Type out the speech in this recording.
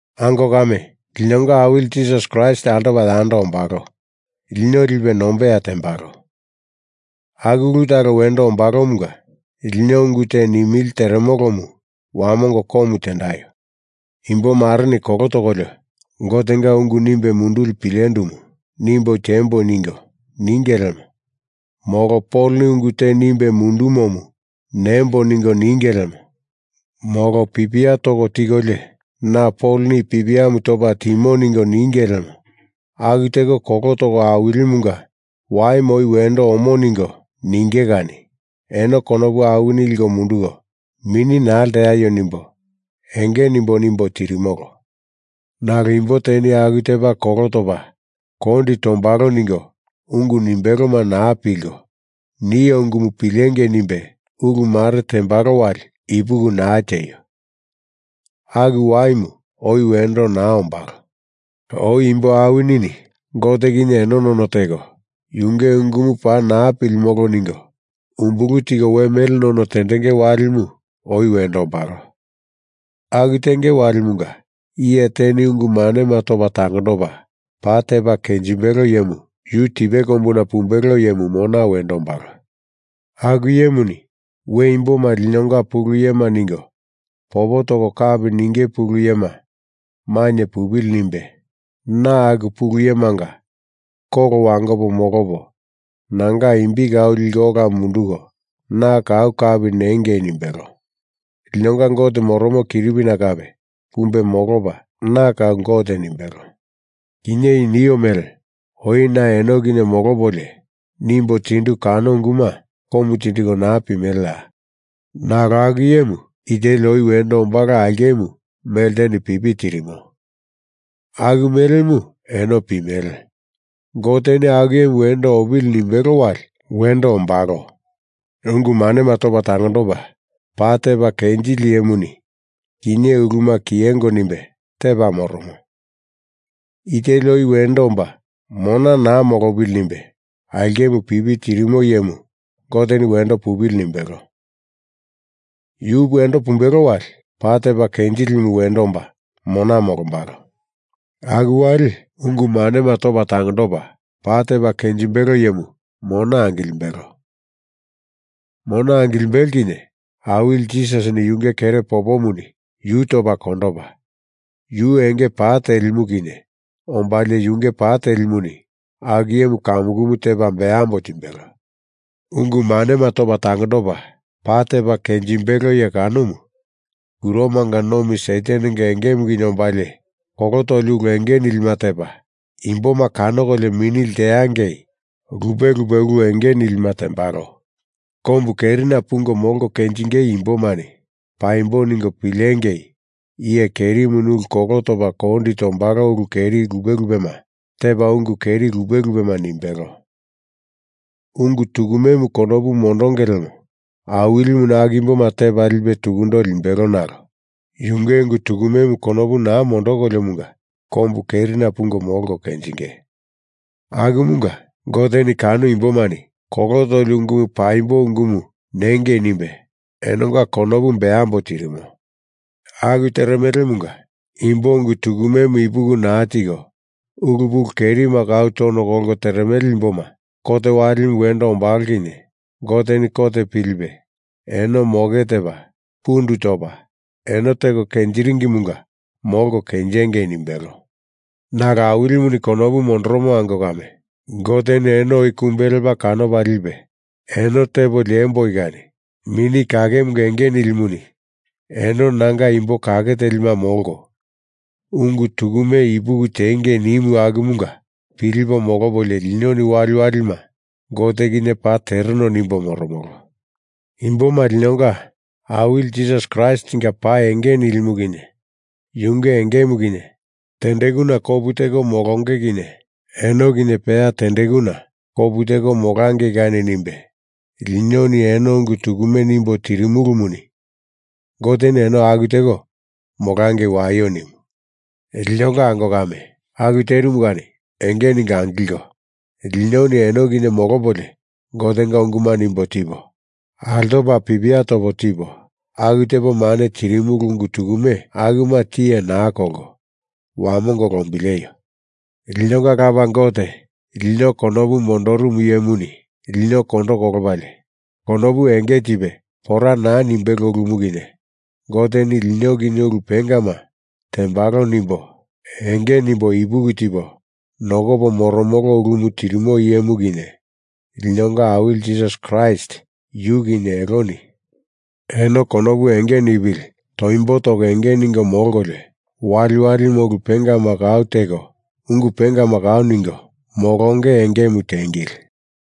Ango kame, linonga Awili Jisasi Kraist altopa yando ombalo lino lipe nombeya tembalo. Aku ulu talo wendo ombalomunga lino ungu te nimili teremolomu wamongo komu tendaio. Imbomareni kolo tokolio Gotenga ungu nimbe munduli pilendumu nimbo tiembo ningo ninge lemo, molo Poloni ungu te nimbe mundumomu nembo ningo ninge lemo, molo pipia toko tikolio na Poloni i pipiamu topa timo ningo ninge lemo, aku teko kolo toko Awilimunga Waimu oi wendo omo ningo ninge kani eno konopu awini liko munduko mini naa lteaio nimbo enge nimbo nimbo tirimolo. Nalo imbo teni aku tepa kolo topa kondi tombalo ningo ungu nimbeloma naa pilko, nio ungumu pilengei nimbe ulu mare tembalo wali ipuki naa tieio. Aku Waimu oi we wendo naa ombalo. Oi imbo awinini Gote kinye eno none teko Yunge ungumu paa naa pilimolo ningo umbulu tiko we mele none tendenge walimu oi wendo ombalo. Aku tenge walimunga iye teni ungu manema topa tangondopa paa tepa kenjimbelo iyemu, yu tipe kombuna pumbelo iyemu mona wendo ombalo. Aku iyemuni we imboma linonga pulu iyema ningo popo toko kapi ninge pulu iyema mainye pupili nimbe, na aku pulu iyemanga kolo wangopo molopo nanga imbi kau liko ola munduko na kau kapi nengei nimbelo. Linonga Gote moromo kiripina kape pumbe molopa na kau Gote nimbelo. Kinye i nio mele oi na eno kinye molopolio nimbo tindu kano unguma komu tindiko naa pimeleya? Nalo aku iyemu i teli oi wendo ombalo aulkemu melteni pipi tirimo, aku melemu eno pimele. Goteni aku iyemu wendo opili nimbelo wali wendo ombalo. Ungu manema topa tangondopa paa tepa kenjili iyemuni kinye uluma kiyengo nimbe tepa moromo. I teli oi wendo omba mona naa molopili nimbe aulkemu pipi tirimo iyemu Goteni wendo pupili nimbelo. Yu wendo pumbelo wali paa tepa kenjilimu wendo omba mona molombalo. Aku wali ungu manema topa tangondopa paa tepa kenjimbelo iyemu mona angilimbelo. Mona angilimbelo kinye Awili Jisasini yunge kere popomuni yu topa kondopa, yu enge pa telimu kinye ombalie yunge pa telimuni aku iyemu kamukumu tepa beambo timbelo. Ungu manema topa tangondopa paa tepa kenjimbelo iye kanomu kuromanga nomi Satanenga engemu kinye ombalie, kolo toli ulu enge nilima tepa, imboma kanokolio mini lteangei lupe lupe ulu enge nilima tembalo. Kombu kerina pungo molko kenjingei imbomani paimbo ningo pilengei iye kerimuni ulu kolo topa kondi tombalo ulu keri lupe lupema tepa ungu keri lupe lupema nimbelo. Ungu tukumemu konopu mondonge lemo Awilimuni aku imboma tepa lipe tukundo limbelo nalo Yunge ungu tukumemu konopu naa mondokoliomunga kombu kerina pungo molko kenjinge. Akumunga Goteni kano imbomani kolo toli ungumu paimbo ungumu nengei nimbe enonga konopu beambo tirimo. Aku teremomunga imbo ungu tukumemu ipuki naa tiko ulu pulu kerima kau tono kolko teremele imboma kot walimu wendo ombalo kinye Goteni kot pilipe eno moke tepa pundu topa eno teko kenjiringimunga molko kenjengei nimbelo. Nalo Awilimuni konopu mondoromo ango kame, Goteni eno oi kumbe lepa kanopa lipe eno tepo liemboi kani Mini Kakemunga enge nilimuni eno nanga imbo kake telima molko, ungu tukume ipuki tiengei nimu akumunga pilipo molopolio linoni waliwalima Gote kinye paa tereno nimbo moromolo. Imboma linonga Awili Jisasi Kraistinga pa enge nilimu kinye yunge engemu kinye tendekuna kopu teko molonge kinye, eno kinye peya tendekuna kopu teko molangei kani nimbe linoni eno ungu tukume nimbo tirimulumuni Goteni eno aku teko molangei waio nimu. Linonga ango kame, aku terimu kani enge ningo angilko, linoni eno kinye molopolio Gotenga unguma nimbo tipo, altopa pipia topo tipo, aku tepo mane tirimulu ungu tukume akuma tiye naa kolko wamongo lombileio. Linonga Lapa Gote, lino konopu mondorumu iyemuni lino kondo kolopalie konopu enge tipe pora naa nimbelo ulumu kinye, Goteni lino kinye ulu pengama tembalo nimbo enge nimbo ipuki tipo nokopo moromolo ulumu tirimo iyemu kinye, linonga Awili Jisasi Kraist yu kinye eloni eno konopu enge nipili toimbo toko enge ningo molkolio waliwalima ulu pengama kau teko ungu pengama kau ningo molonge engemu tiengili.